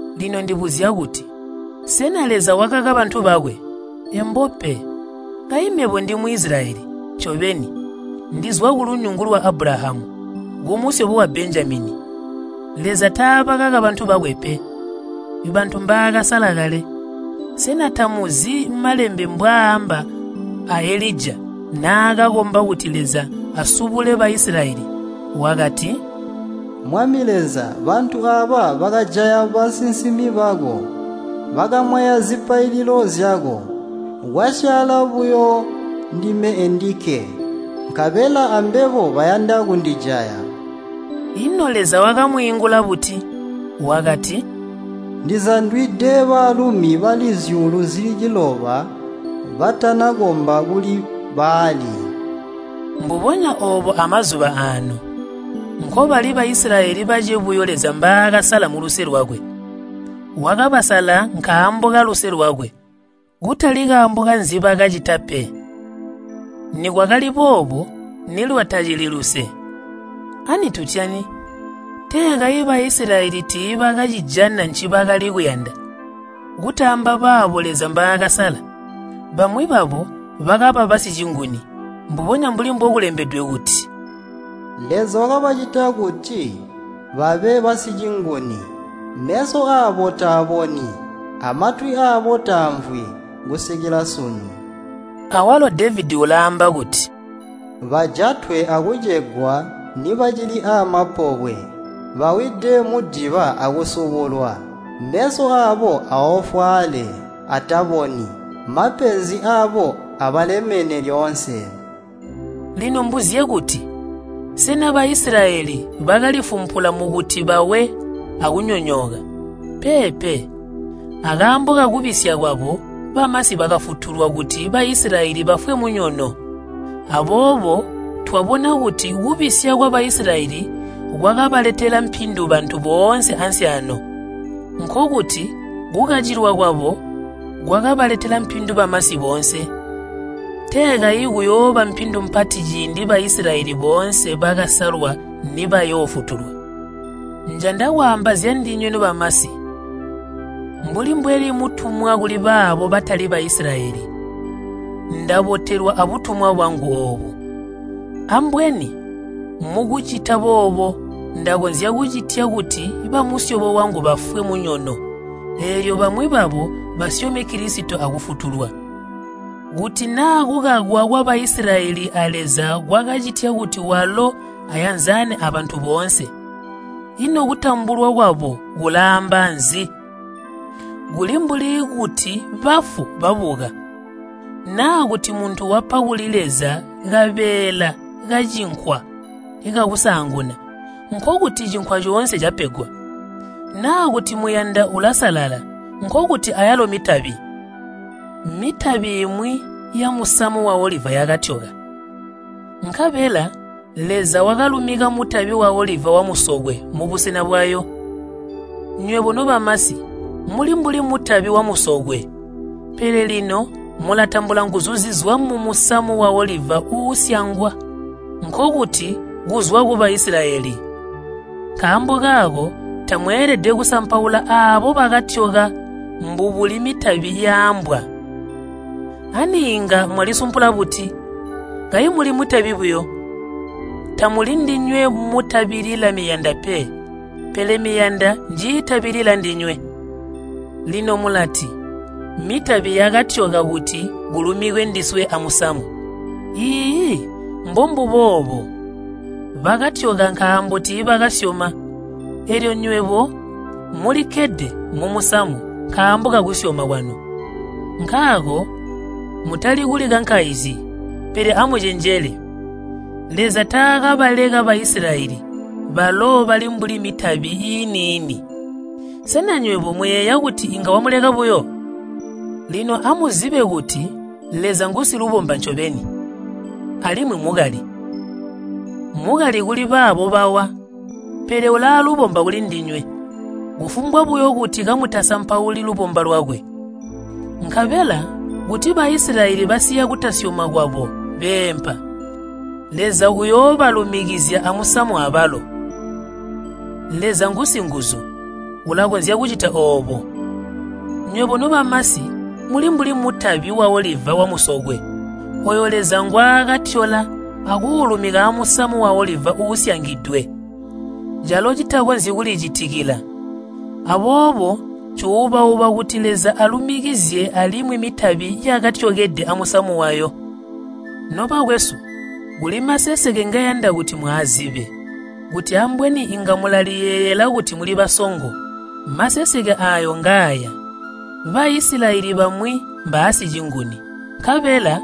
Lino ndibuzya kuti, sena Leza wakaka bantu bakwe? Embo pe! Kayi mebo ndi Muisilayeli! Ncobeni, ndizwa kulunyungu lwa Abulahamu, kumusyobo wa Benjamini. Leza taabakaka bantu bakwe pe, bantu mbaakasala kale. Sena tamuzi Malembe mbwaamba a Elija naakakomba kuti Leza asubule Baisilayeli? Wakati, “Mwami Leza, bantu aaba bakajaya basinsimi bako, bakamwaya zipaililo zyako. Kwasyaala buyo ndime endikke, nkabela ambebo bayanda kundijaya.” Ino Leza wakamwiingula buti? Wakati, “Ndizandwide baalumi bali zyuulu zili ciloba batanakomba kuli Baali.” Mbubonya oobo amazuba aano. Nkobali Baisilayeli bace buyo Leza mbaakasala muluse lwakwe. Wakabasala nkaambo kaluse lwakwe, kutali kaambo kanzibakacita pe. Nikwakali boobo, nilwatacili luse. Ani tutyani? Tee kayi Baisilayeli tiibacijana ncibakali kuyanda, kutaamba baabo Leza mbaakasala. Bamwi babo bakaba basicinguni. Mbubonya mbuli mbokulembedwe kuti, “Leza wakabacitya kuti babe basicinguni. Meso aabo taaboni, amatwi aabo taamvwi, kusikila sunu.” Awalo Devedi ulaamba kuti, “Bajatwe akucegwa nibacili amapobwe. Bawide mudiba akusubulwa. Meso aabo aofwaale, ataboni. Mapenzi aabo abalemene lyoonse.” Lino mbuzye kuti, sena Baisilayeli bakalifumpula mukuti bawe akunyonyooka? Peepe, akaambo kakubisya kwabo, bamasi bakafutulwa kuti Baisilayeli bafwe munyono. Aboobo twabona kuti kubisya kwa Baisilayeli kwakabaletela mpindu bantu boonse ansi aano, nkokuti kukacilwa kwabo kwakabaletela mpindu bamasi boonse. Tee kayi kuyooba mpindu mpati ciindi Baisilayeli boonse bakasalwa nibayoofutulwa. Njanda kwaamba zyandinywe nobamasi. Mbuli mbweli mutumwa kuli baabo batali Baisilayeli, ndabotelwa abutumwa bwangu oobu. Ambweni mukucita boobo ndakonzya kucitya kuti bamusyobo wangu bafwe munyono, eelyo bamwi babo basyome Kilisito akufutulwa. Kuti naa kukakwa kwa Baisilayeli a Leza kwakacitya kuti walo ayanzane abantu boonse, ino kutambulwa kwabo kulaamba nzi? Kuli mbuli kuti bafu babuka. Naa kuti muntu wapa kuli Leza kabeela kacinkwa kakusaanguna, nkokuti cinkwa coonse capegwa. Naa kuti muyanda ulasalala, nkokuti ayalo mitabi. Mitabi imwi yamusamu waoliva yakatyoka, nkabela Leza wakalumika mutabi waoliva wamusokwe mubusena bwayo. Nywebo nobamasi muli mbuli mutabi wamusokwe, pele lino mulatambula nguzu zizwa mumusamu waoliva uusyangwa, nkokuti kuzwa ku Baisilayeli. Nkaambo kaako tamweelede kusampaula aabo bakatyoka mbubuli mitabi yaambwa. Ani inga mwalisumpula buti? Kayi muli mitabi buyo! Tamuli ndinywe mutabilila miyanda pe, pele miyanda njiitabilila ndinywe. Lino mulati, “Mitabi yakatyoka kuti kulumikwe ndiswe amusamu.” Iiyi, mbombubo oobo. Bakatyoka nkaambo tiibakasyoma, eelyo nywebo mulikkede mumusamu nkaambo kakusyoma kwanu. Nkaako mutali kulikankaizyi, pele amucenjele. Leza taakabaleka Baisilayeli, balo bali mbuli mitabi iini-ini. Sena nywebo muyeeya kuti inga wamuleka buyo? Lino amuzibe kuti Leza ngusilubomba ncobeni, alimwi mukali. Mukali kuli baabo bawa, pele ulaalubomba kulindinywe, kufumbwa buyo kuti kamutasampauli lubomba lwakwe. Nkabela kuti Baisilayeli basiya kutasyoma kwabo beempa, Leza uyoobalumikizya amusamu abalo. Leza ngusinguzu, ulakonzya kucita oobo. Nywebo nobamasi muli mbuli mutabi waoliva wamusokwe, ooyo Leza ngwaakatyola akuulumika amusamu waoliva uusyangidwe, calo citakonzyi kulicitikila. Aboobo ncuuba-uba kuti Leza alumikizye alimwi mitabi yakatyokede amusamu wayo. Nobakwesu, kuli maseseke ngeyanda kuti mwaazibe, kuti ambweni inga mulaliyeyeela kuti muli basongo. Maseseke aayo ngaaya, Baisilayeli bamwi mbaasicinguni, nkabela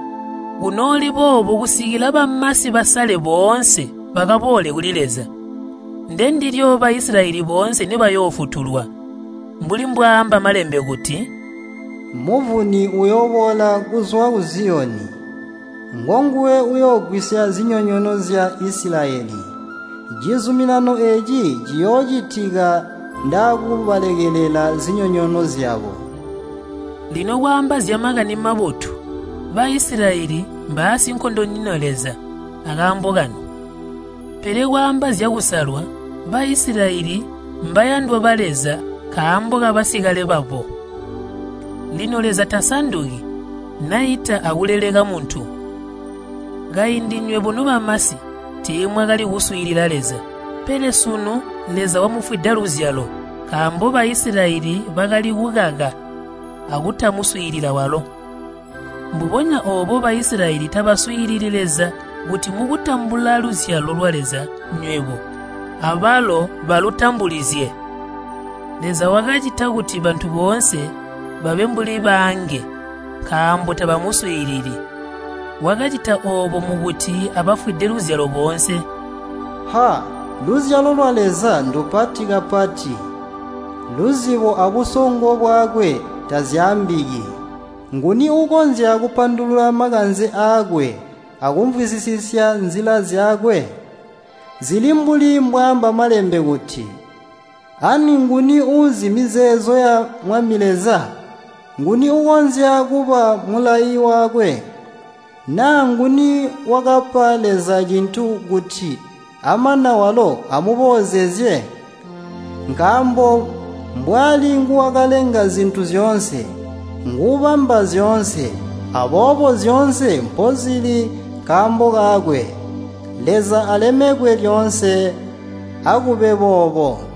kunooli boobo kusikila bamasi basale boonse bakaboole kuli Leza. Ndendilyo Baisilayeli boonse nibayoofutulwa. Mbuli mbwaaamba Malembe kuti, “Muvuni uyooboola kuzwa ku Ziyoni. Ngonguwe uyoogwisya zinyonyoono zya Isilayeli. Cizuminano eeci ciyoocitika ndaakubalekelela zinyonyoono zyabo.” Lino kwaamba zya Makani Mabotu Baisilayeli mbaasinkondonyina Leza akaambo kanu. Pele kwaamba zyakusalwa, Baisilayeli mbayandwa ba Leza nkaambo kabasikale babo. Lino Leza tasanduki, naita akuleleka muntu. Kaindi nywebo nobamasi tiimwakali kuswiilila Leza, pele sunu Leza wamufwida luzyalo nkaambo Baisilayeli bakali kukaka akutamuswiilila walo. Mbubonya oobo Baisilayeli tabaswiilili Leza kuti mukutambula luzyalo lwa Leza nywebo, abalo balutambulizye. Leza wakacita kuti bantu boonse babe mbuli baange nkaambo tabamuswiilili. Wakacita oobo mukuti abafwide luzyalo boonse. Ha! luzyalo lwa Leza ndupati kapati! Luzibo abusongo bwakwe tazyaambiki! Nguni uukonzya kupandulula makanze aakwe akumvwisisya nzila zyakwe? Zili mbuli mbwaaamba Malembe kuti, “Ani nguni uuzi mizeezo ya Mwami Leza? Nguni uukonzya kuba mulayi wakwe? Naa nguni wakapa Leza cintu, kuti amana walo amuboozezye?” Nkaambo mbwali nguwakalenga zintu zyoonse, nguubamba zyoonse, aboobo zyoonse mpozili nkaambo kakwe. Leza alemekwe lyoonse. Akube boobo!